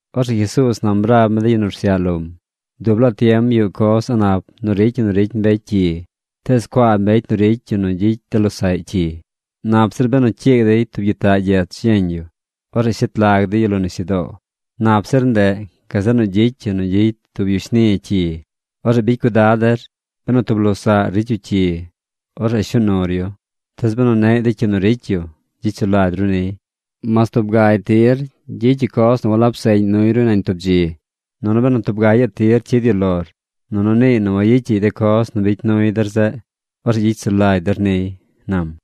Orzeꞌ Jesuuz nam rab mi de yu nu rsyaꞌ lom: ―Dub laa tiem yuꞌ coz a̱ꞌ nap nu ricy ñi nu ricy mbecy cyi. ¡Tees cuaa mbecy nu ricy yu nu gyicy de losaꞌy cyi! Nap zir benu cyiig dey tub gyitaꞌ gyech yeñ yu. Orzeꞌ shet lag dey yu lo nisyudoo. Nap zir ndeꞌ gazeꞌ nu gyicy yu nu gyicy tub yu shni cyi. ¡Orzeꞌ bicy cuidad der! ’Benu tub losaꞌr ricy yu cyi, orzeꞌ shuu nur yu. Tees benu neꞌy de cyi nu ricy yu, gyicy sulagy ru niy. Mas tub gagy tir gyicy yu coz nu walab seꞌñ nuy ru nañ tub dzi, nunu benu tub ga gaꞌ tir cyid yu lor nunu niiy nu wayicyaꞌy de coz nu bicy nuy der zeꞌ, orzeꞌ gyicy sulagy der niy ―nam.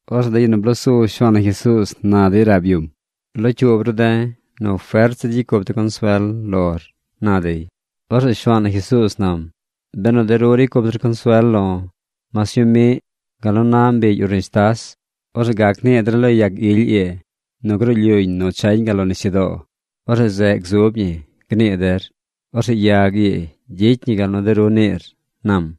Orzeꞌ de yu nu bloo su Shuaan na Jesuuz na dey rab yum: ―Locyuub ru de̱ nu fert zir gyicy cup de̱ consuel lor ―na dey. Orzeꞌ Shuaan na Jesuuz nam: ―Benu de ru ricy cup der consuel lo̱ mas ñuu miꞌ, gal nu na mbigy urnishtas, orzeꞌ gac nii der lo yag ily ii nu gruu lyuñ nu chañ gal lo nisyudoo. Orzeꞌ zeꞌ gzub ñi, gnii der. Orzeꞌ yag ii gyicy ñi gal nu de ru niir ―nam―.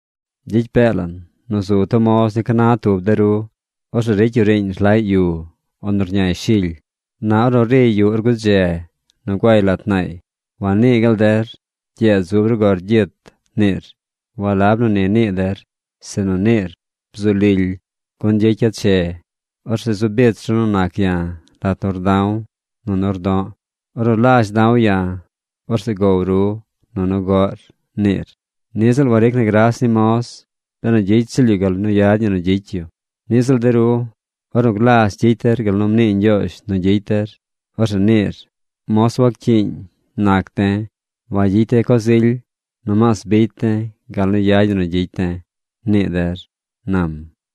’Gyicy pee lan nu zu tub moz ni ca na tub de ru. Orzeꞌ ricy yu riiñ rlaꞌy yu, o nu rñay shily. Na ornu riy yuꞌ or gudze nu guay lat naay, wanii gaal der: “Gyeed zub ru gor gyit”, niir. Walab nu ni nii der, sinu niir: “Bzu lily, gun gyicya̱ che. Orzeꞌ zu bich ru nu nac ya̱ lat nu rda̱w nunu rdo̱ꞌ. Ornu lazh da̱w ya̱, orzeꞌ gow ru, nunu goꞌr”, niir. Niꞌ ziꞌl waric na gras ni moz benu gyicy ziꞌl yu gal nu yad ñi nu gyicy yu. Niꞌ ziꞌl de ru, ornu glazh gyicy der gal nu mnii Ñgyoozh nu gyicy der, orzeꞌ niir: “Gur moz ziꞌl nac de̱. Wangyicy de̱ coz ily. Nomaas bicy de̱ gal nu yad ñi nu gyicy de̱”, nii der ―nam.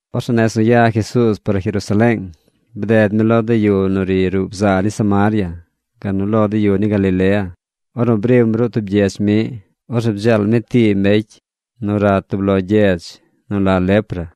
Orzeꞌ nez nu ya Jesuuz par Jerusaleeng, bded mi lo de yu nu ri ruꞌ bzaa ni Samaria, gal nu lo de yu ni Galilea. Ornu brim ruꞌ tub gyedz miꞌ, orzeꞌ bdzeel mi tii mbecy nu rat tub lo güii nu la lepra.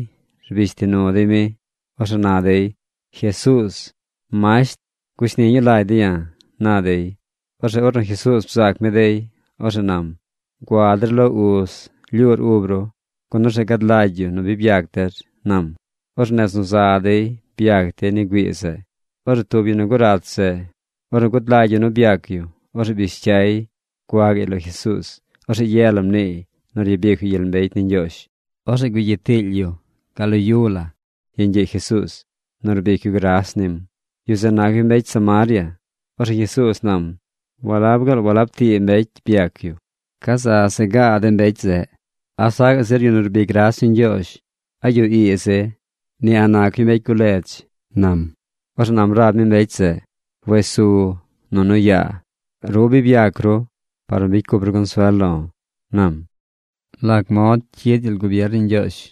rbish ti nu dey mi. Orzeꞌ na dey: ―¡Jesuuz, masht, gushni ñuu lagy de̱ ya̱! ―na dey. Orzeꞌ ornu Jesuuz bzaac mi dey, orzeꞌ nam: ―Gua der lo uz rlyuur ub ru, gun orzeꞌ gad lagy yu nu bi byac der ―nam. Orzeꞌ nez nu za dey byac dey ni güii zeꞌ. Orzeꞌ tub yu nu gurat zeꞌ, ornu gud lagy yu nu byac yu, orzeꞌ bish cyay gua gaꞌy lo Jesuuz. Orzeꞌ ye la rniiy nu ryabic yu gyel mbecy ni Ñgyoozh. Orzeꞌ gugyit tiily yu gal lo yu la yeñ gyiꞌ Jesuuz nu rbic yu gras nim. Yu zeꞌ nac yu mbecy Samaria. Orzeꞌ Jesuuz nam: ―¿Walab gaal walab tii mbecy byac yu? ¿Ca za se gaa de mbecy zeꞌ? ¿A sacaꞌ zir yu nu rbic gras ni Ñgyoozh gazeꞌ mbecy ii? Ni a̱ꞌ nac yu mbecy guledz ―nam. Orzeꞌ nam rab mi mbecy zeꞌ: ―Wes su, nunu yaa. Ru bi byac ru par nu bicy cup ru consuel lo̱ ―nam. ¿Lac mod cyid gyel gubier ni Ñgyoozh?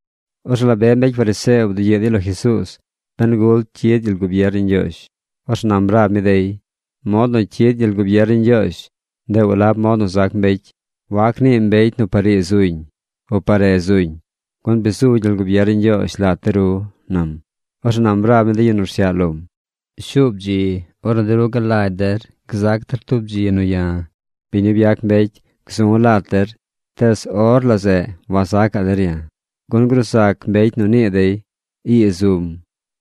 Orzeꞌ la be mbecy fariseo bdugyiꞌ dey lo Jesuuz ben gul cyid gyel gubier ni Ñgyoozh. Orzeꞌ nam rab mi dey: ―Mod nu cyid gyel gubier ni Ñgyoozh, ndeꞌ walab mod nu zac mbecy. Wac nii mbecy nu par ii zuñ, o par re zuñ. Gun bi zu gyel gubier ni Ñgyoozh lat de ru ―nam. Orzeꞌ nam rab mi de yu nu rsyaꞌ lom: ―Shuub dzi ornu de ru galagy der gzac der tub dzi nu ya̱, biñ nu byac mbecy, gzu̱ lat der, tees or la zeꞌ wazacaꞌ der ya̱. Gun gruu zac mbecy nu nii dey: “Ii zum”,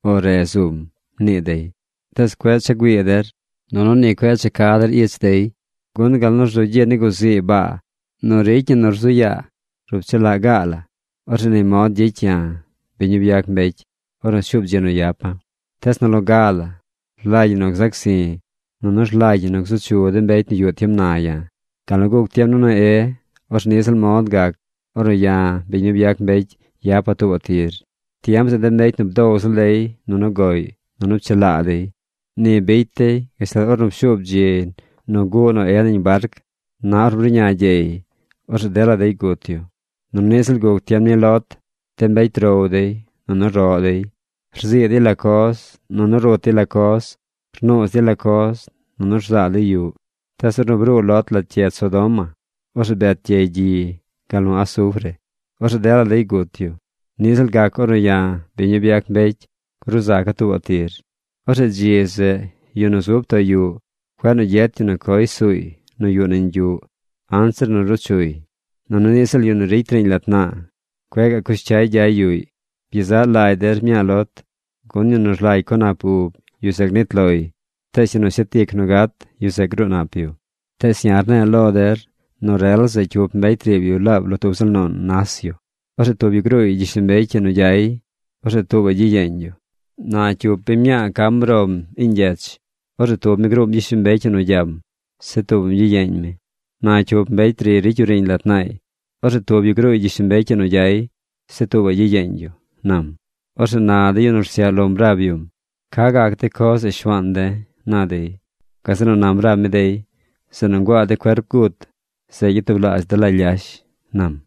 o “Re zum”, nii dey. Tees cueꞌ cha güii der, nunu ni cueꞌ cha ca der ich dey. Gun gal nu rzu gyi ni guzii baa nu ricy ñi nu rzu yaa rup chu laꞌ gaa la, orzeꞌ ni mod gyicy ya̱, biñ nu byac mbecy, ornu shuub dzi nu yapa̱. Tees nu loga la rlagy ñi nu gzac zi̱. Nunu rlagy ñi nu gzu chu de mbecy nu yuꞌ tiem na ya̱. Gal nu guc tiem ni Noé, orzeꞌ niꞌ ziꞌl mod gac ornu ya̱, biñ nu byac mbecy, yapa̱ tuubaꞌ tir. Tiem zeꞌ de mbecy nu bdow ziꞌl dey, nunu goꞌy, nunu pchelaa dey. Ni bicy dey gashtal ornu pshuub dzi nu guꞌ Noé nañ barc. Na ornu bruꞌña gyey, orzeꞌ dela dey gut yu. Nunu niꞌ ziꞌl guc tiem ni Lot. De mbecy row dey, nunu roꞌ dey. Rzii dey la coz, nunu rut dey la coz. Rnuuz dey la coz, nunu rzaa dey yuꞌ. Tees ornu bruu Lot lat gyedz Sodoma, orzeꞌ bet gyey gyi gal nu asufre. Orzeꞌ dela dey gut yu. Niꞌ ziꞌl gac ornu ya̱, biñ nu byac mbecy, gruu zaca̱ tuubaꞌ tir. ’Orzeꞌ dzi zeꞌ yu nu zub too yuꞌ, cueꞌ nu gyet yu nu coy suuy nu yuꞌ nañ yuꞌ anzir nu ruu chuy. Nunu niꞌ ziꞌl yu nu ricy riiñ lat naa, cueꞌ gaꞌ cush cyay gyay yuꞌy. Byezaꞌ lagy der mñaa Lot. Gun yu nu rlagy co nap ub, yu zeꞌ gnit loy. Tees yu nu shet ic nu gat, yu zeꞌ gruu nap yu. ’Tees ya̱ rne̱e̱ lo der nu rel zeꞌ cyup mbecy riib yu laab lo tub ziꞌl nuun nas yu. Orzeꞌ tub yu gruuy gyishlombecy ii nu gyay. Orzeꞌ tuubaꞌy gyiyeeñ yu. Na cyup biñ mñaa cam rom iiñ gyech. Orzeꞌ tub mi gruum gyishlombecy ii nu gyam. Zeꞌ tuubaꞌm gyiyeeñ mi. Na cyup mbecy riy ricy yu riiñ lat naay. Orzeꞌ tub yu gruuy gyishlombecy ii nu gyay. Zeꞌ tuubaꞌy gyiyeeñ yu ―nam. Orzeꞌ na de yu nu rsyaꞌ lom rab yum: ―¿Ca gac de coz zeꞌ Shuaan de̱? ―na dey. Gazeꞌ nu nam rab mi dey: ―Zeꞌ nu nguaa de cuerp gut, zeꞌ gyatublaazh dela lyash ―nam.